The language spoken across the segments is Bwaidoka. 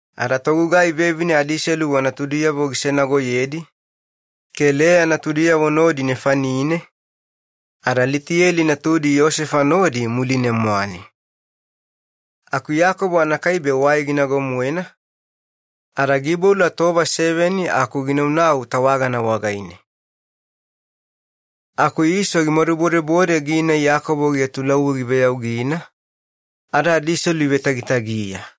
Ada togugai vevine adiselu wanatudiyavo gisenagoyedi ke Leya natudiyavo nodi nefanine ada Litiyeli natudi Yosefa nodi muline-mwane. Aku Iyakobo anakaibe wai ginago-moena, ada giiboula tova seveni aku ginaunau tawagana wagaine. Aku Iso gimadubodebode gina Iyakobo giatulauwi giveyaugina, ada ivetagitagiya.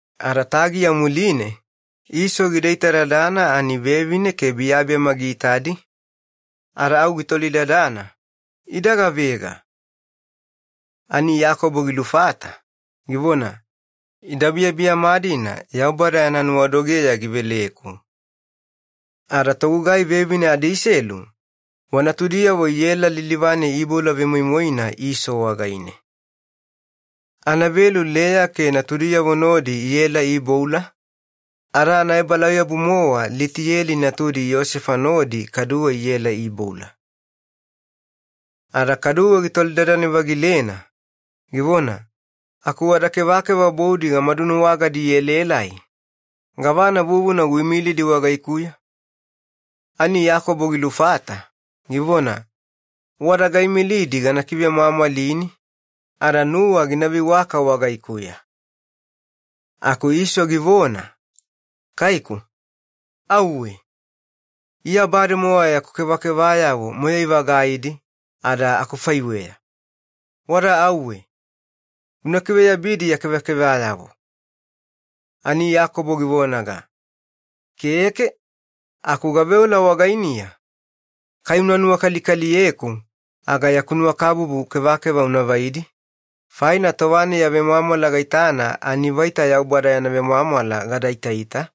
Ada tagiya muline Iso gida itadadana ani vevine ke biyabiyama giitadi, ada au gitolidadana, “Ida gavega?” Ani Iyakobo gilufata, givona, “Ida biyabiyama-dina Yaubada yana nuwadogeya giveleku.” Ada togugai vevine adiselu wanatudiyavo iela lilivane iiboula vemoimoina Iso wagaine. Anavelu Leya ke natudiyavo nodi iela iiboula, ada anaebalauyabu-mowa Litiyeli natudi Yosefa nodi kaduwe iela iiboula. Ada kaduwe gitolidadane-vagilena, givona, “Aku wada kevakeva boudi gamadunuwagadi ielaelai, gavana vuvuna uimilidi wagaikuya?” Ani Iyakobo gilufata, givona, “Wada gaimilidi gana kivemwamwalini ada nuwa gina veiwaka wagaikuya.” Aku Iso givona, “Kaiku, auwe. Iya bademowa yaku kevakevayavo moyai-vagaidi ada akufaiweya. Wada auwe una kiveyabidi ya kevakevayavo.” Ani Iyakobo givonaga, “Keke, aku gaveola wagainiya, kai unuwakalikaliyeku aga yaku nuwakabubu kevakeva unavaidi, faina tova-nai ya vemwamwala gaitana ani vaita Yaubada yana vemwamwala gadaitaita,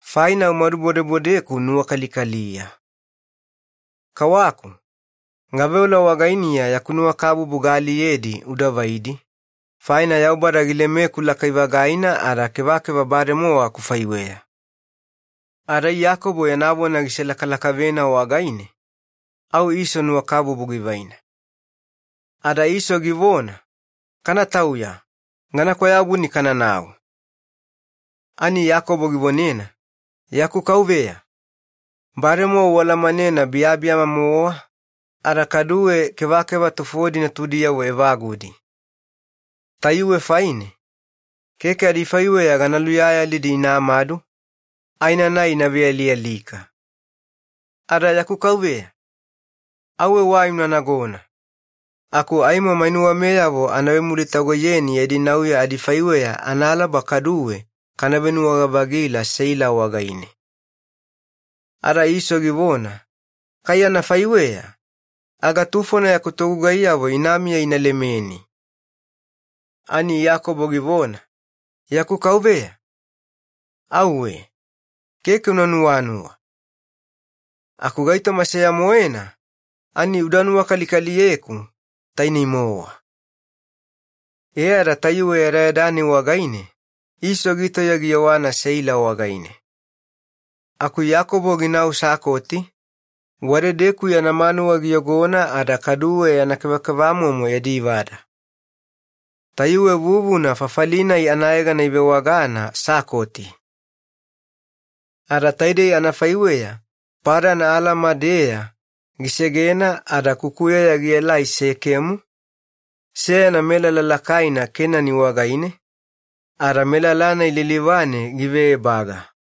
faina umadubodebodeku nuwakalikaliya. Kawaku, gaveola wagainiya yaku nuwakabubu ialiyedi udavaidi, faina Yaubada gilemeku lakai-vagaina ada kevakeva bademowa akufaiweya.” Ada Iyakobo yana vona giselakalakavena wagaine au Iso nuwakabubu givaina. Ada Iso givona, “Kanatauya, gana kwayabuni kananau.” Ani Iyakobo givonena, “Yaku kauveya, bademowa ualamanena biyabiyama-mowa ada kaduwe kevakeva tufodi natudiyavo evagudi. Tayuwe faine keke adifaiweya gana luyayalidi inamadu, aenanai ina vealialika. Ada yaku kauveya, auwe wai una nagona, aku aimo mainuwameyavo ana vemulitagoiyeni yadi nauya adifaiweya analaba kaduwe kana venuwaga-vagila Seila wagaine.” Ada Iso givona, “Kai anafaiweya aga tufona yaku togugaiyavo inamiya inalemeni.” Ani Iyakobo givona, “Yaku kauveya, auwe, keke una nuwanuwa. Aku gaitoma seya-moena ani uda nuwakalikaliyeku, tainei-mowa.” E ada tayuwe yadayada-nai wagaine Iso gitauya giyewana Seila wagaine. Aku Iyakobo ginau Sakoti, wadedeku yana manuwa giyogona ada kaduwe yana kevakevamomo yadi vada. Tayuwe vuvuna fafali-nai anayegana ivewagana Sakoti. Ada taidei anafaiweya Padan Alama-deya gisegena ada kukuyeya gielai Sekemu, seyana melala lakaina Kenani wagaine, ada melala-nai lilivane giveebaga.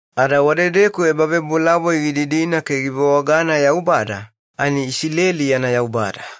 Ada wadedeku ebavebolavoi gididina ke givewagana ‘Yaubada, ani Isileli yana Yaubada’.